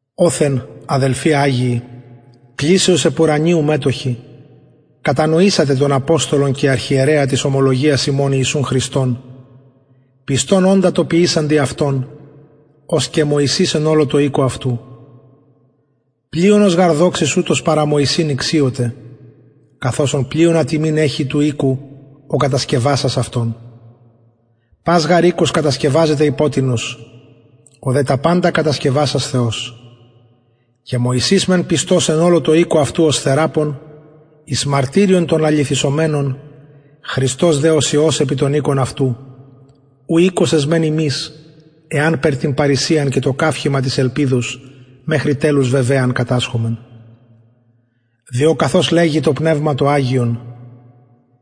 οθεν αδελφοι αγιοι κλησεως επουρανιου μετοχοι κατανοησατε τον αποστολον και αρχιερεα της ομολογιας ημων ιησουν χριστον πιστον οντα τω ποιησαντι αυτον ως και μωυσης εν ολω τω οικω αυτου πλειονος γαρ δοξης ουτος παρα μωυσην ηξιωται καθ οσον πλειονα τιμην εχει του οικου ο κατασκευασας αυτον πας γαρ οικος κατασκευαζεται υπο τινος ο δε τα παντα κατασκευασας θεος και μωυσης μεν πιστος εν ολω τω οικω αυτου ως θεραπων εις μαρτυριον των λαληθησομενων χριστος δε ως υιος επι τον οικον αυτου ου οικος εσμεν ημεις εανπερ την παρρησιαν και το καυχημα της ελπιδος μεχρι τελους βεβαιαν κατασχωμεν διο καθως λεγει το πνευμα το αγιον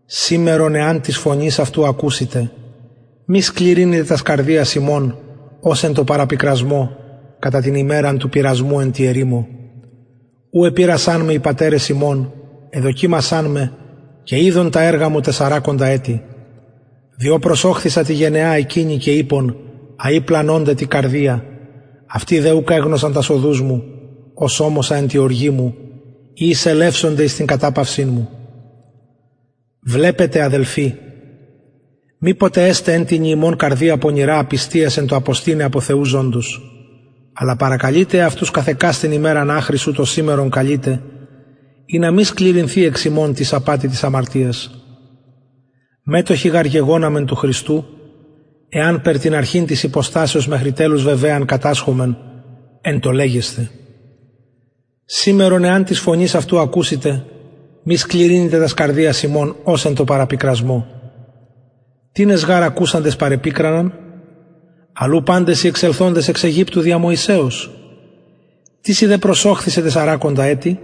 σημερον εαν της φωνης αυτου ακουσητε μη σκληρυνητε τας καρδιας υμων ως εν τω παραπικρασμω κατα την ημεραν του πειρασμου εν τη ερημω ου επειρασαν με οι πατερες υμων εδοκιμασαν με και ειδον τα εργα μου τεσσαρακοντα ετη διο προσωχθισα τη γενεα εκεινη και ειπον αει πλανωνται τη καρδια αυτοι δε ουκ εγνωσαν τας οδους μου ως ωμοσα εν τη οργη μου ει εισελευσονται εις την καταπαυσιν μου βλεπετε αδελφοι μηποτε εσται εν τινι υμων καρδια πονηρα απιστιας εν τω αποστηναι απο θεου ζωντος αλλα παρακαλειτε εαυτους καθ εκαστην ημεραν αχρι ου το σημερον καλειται ινα μη σκληρυνθη εξ υμων τις απατη της αμαρτιας μετοχοι γαρ γεγοναμεν του χριστου εανπερ την αρχην της υποστασεως μεχρι τελους βεβαιαν κατασχωμεν εν τω λεγεσθαι σημερον εαν της φωνης αυτου ακουσητε μη σκληρυνητε τας καρδιας υμων ως εν τω παραπικρασμω τινες γαρ ακουσαντες παρεπικραναν αλλ ου παντες οι εξελθοντες εξ αιγυπτου δια μωυσεως τισιν δε προσωχθισεν τεσσαρακοντα ετη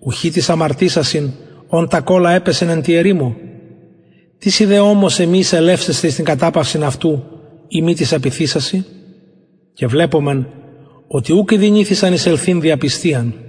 ουχι τοις αμαρτησασιν ων τα κωλα επεσεν εν τη ερημω τισιν δε ωμοσεν μη εισελευσεσθαι εις την καταπαυσιν αυτου ει μη τοις απειθησασιν και βλεπομεν οτι ουκ ηδυνηθησαν εισελθειν δι απιστιαν